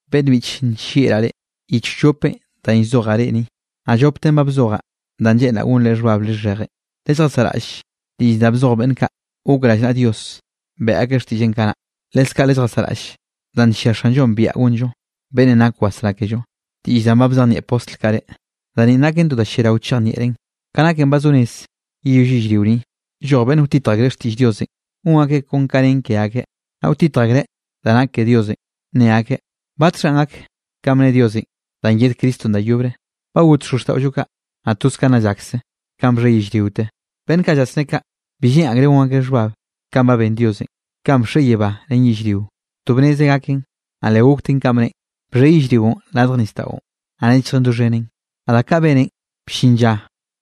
Beꞌnn biꞌche, nllieꞌraꞌ reꞌ, yich wllopenꞌ danꞌ llzojaꞌ reꞌ ni. Naꞌ lloptenꞌ ba bzojaꞌ danꞌ lleꞌnraꞌ gonre xhbab lixheje. Lelljasaꞌraꞌll diꞌll danꞌ bzoj beꞌnn kaꞌ gok rallnaꞌa Dios beꞌe akeꞌ xtiꞌlleꞌn kanaꞌ. Leskaꞌ lelljasaꞌraꞌll danꞌ nllia Xanllo biaꞌa gonllo, beꞌnnenꞌ nak wasrá kello, diꞌll danꞌ ba bzejnieꞌ postl kaꞌ reꞌ. Da ni naken to da lliarao chejnieꞌrenꞌ. Ka naken ba zo rez yeyoll yellrio ni, lloj beꞌnn wtitj akreꞌ xtiꞌll Diosenꞌ, gon akeꞌ kon kanꞌ nen ke akeꞌ. Naꞌ wtitj akreꞌ da nak ke Diosenꞌ nne akeꞌ: “¿Batxhanꞌ gak kanꞌ bne Diosenꞌ danꞌ yed Cristonꞌ da yobre? Ba got xozxtaꞌollo kaꞌ, naꞌ toz ka nna llakse kanꞌ bxhe yellriote.” Beꞌnn kaꞌ llasné kaꞌ, bi lleꞌn akreꞌ gon akeꞌ xhbab kanꞌ ba ben Diosenꞌ. Kanꞌ bxhe yebá ren yellrio, to bnezeꞌ gaken, naꞌ le gokten kanꞌ bneꞌen. Bxhe yellrionꞌ radj nisdaꞌon, naꞌ nechjen doxhenen. Naꞌ da kaꞌ beneꞌn, bllin lla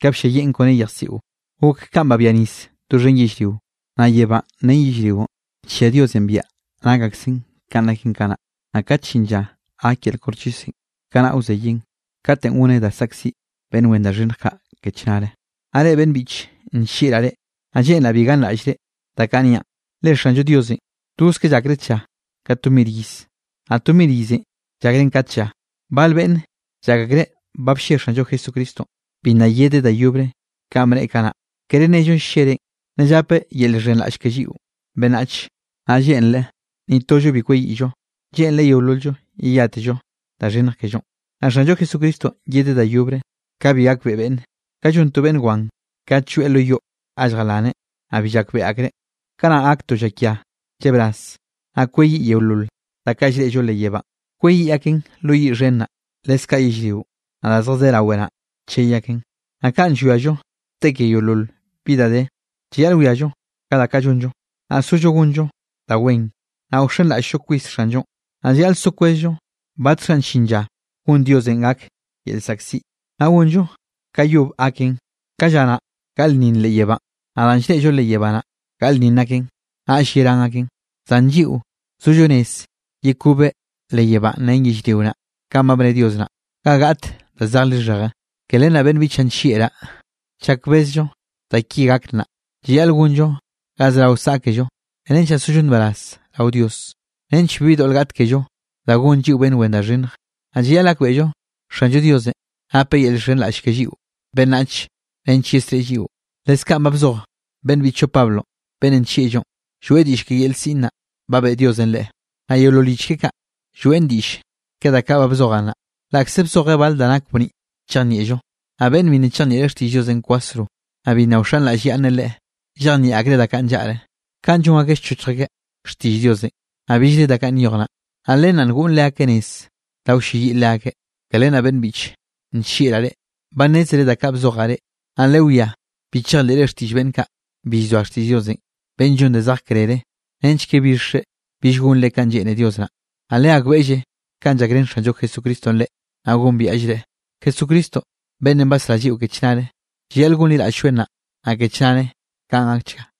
ka blliayieꞌn kone yejsiꞌon gok kanꞌ babia nisenꞌ doxhen yellrio. Naꞌ yebánꞌ ren yellrionꞌ, nllia Diosenꞌ biaꞌa nak aksen kanꞌ naken kanaꞌ, naꞌ kat llin lla gak yel koxchisenꞌ, kanaꞌ wzeyeꞌn katenꞌ goneꞌ da saꞌkziꞌ beꞌnn wen da xhinnj kaꞌ ke chnare. Naꞌ reꞌ beꞌnn biꞌche, nllieꞌraꞌ reꞌ, naꞌ lleꞌnraꞌ bi ganraꞌllre da kaꞌ niaꞌn, le Xanllo Diosenꞌ toz ka llakreꞌ tlla, ka to mir iz, naꞌ to mir izenꞌ llakreꞌn ka tlla. Bal beꞌnne llak akreꞌ ba blle Xanllo Jesucristonꞌ, bi nna yedeꞌ da yobre kanꞌ bneꞌe kanaꞌ. Kere nello ll-llereꞌn, nna llapeꞌ yel llxhenraꞌll ke lliꞌo beꞌnnachenꞌ, naꞌ lleꞌnreꞌ ni tollo bi kweyiꞌllo. Lleꞌnreꞌ yeolol-llo yeyátello da xhinnj kellonꞌ. Naꞌ Xanllo Jesucristonꞌ yedeꞌ da yobre ka bi gakbeꞌe beꞌnne, ka llon to beꞌnn wan kat lloeꞌ lo yoꞌ ga lljalaneꞌ, naꞌ bi llakbeꞌe akreꞌ. Kanaꞌ gak to llakia llebraz, naꞌ kweyiꞌ yeolol da kaꞌ llreꞌllo leꞌ yebánꞌ, kweyiꞌ aken lo yiꞌ xhen naꞌ, leskaꞌ yellrionꞌ, naꞌ da zjadé rawe naꞌ, chey aken. Naꞌ kanꞌ llwiallo te ke yeolol bi da de, llayaꞌl wiallo ka da kaꞌ llonllo, naꞌ sollo gonllo da wen, naꞌ wxenraꞌll-llo kwis Xanllonꞌ. Naꞌ llayaꞌl so kwezllo batxhanꞌ llin lla gon Diosenꞌ gak yel llzaꞌkziꞌ, naꞌ gonllo ka yob gaken. Ka lla naꞌ gaꞌlnninn leꞌ yebánꞌ, naꞌ danꞌ llreꞌllo leꞌ yebá naꞌ, gaꞌlnninn aken, naꞌll yerán aken. Zan lliꞌo zollo rez yekobeꞌ leꞌ yebánꞌ ren yellrio naꞌ, kanꞌ ba bne Dios naꞌ, ga gaꞌt da zej lixheje. Ke len naꞌ beꞌnn biꞌchaꞌ nllieꞌraꞌ, chak bezllo da ki gak naꞌ, llayaꞌl gonllo ga zerao saꞌkello nench naꞌ sollo nbaraz rao Dios, nench bibi doꞌl gaꞌt kello da gon lliꞌo beꞌnn wen da xhinnj. Naꞌ llayaꞌl gakbeꞌllo Xanllo Diosenꞌ napeꞌ yel llxhenraꞌll ke lliꞌo beꞌnnach nench yesreꞌe lliꞌo. Leskaꞌn ba bzoj beꞌnn biꞌchllo Pablo beꞌnnenꞌ nllieꞌllonꞌ, lloeꞌ diꞌll ke yel siꞌn naꞌ, ba beꞌe Diosenꞌ leꞌe. Naꞌ yeolol yich keꞌe kaꞌ, lloeꞌn diꞌll ke da kaꞌ ba bzojaꞌ naꞌ, laꞌkze bzojeꞌ bal da nak bniꞌ chejnieꞌllo. Naꞌ beꞌnn bi nna chejnieꞌreꞌ xtiꞌll Diosenꞌ kwasro, naꞌ bi nna wxenraꞌllyaꞌnneꞌ Leꞌe, llejnieꞌ akreꞌ da kaꞌ nllaꞌre, kaꞌn llon akeꞌ llchok akeꞌ xtiꞌll Diosenꞌ, naꞌ billre da kaꞌ nyoj naꞌ, naꞌ len naꞌ ngoꞌn leakeꞌ nez da wlleyiꞌ leakeꞌ. Ke len naꞌ beꞌnn biꞌche, nllieꞌraꞌ reꞌ, ba nnézere da kaꞌ bzojaꞌ reꞌ. Naꞌ lewiá bi chejleꞌre xtiꞌll beꞌnn kaꞌ bi llzoa xtiꞌll Diosenꞌ, beꞌnn llon da zej krere, nench ke bixre bill gonre kanꞌ lleꞌne Dios naꞌ. Naꞌ legakbeꞌlle kanꞌ llakrén Xanllo Jesucristonꞌ reꞌ naꞌ gombiaꞌllreꞌ, Jesucristo beꞌnnenꞌ basrá lliꞌo ke chnare. Llayaꞌl gonliraꞌll-lloeꞌ nnaꞌ, naꞌ ke chnare. Kaꞌn gakchga.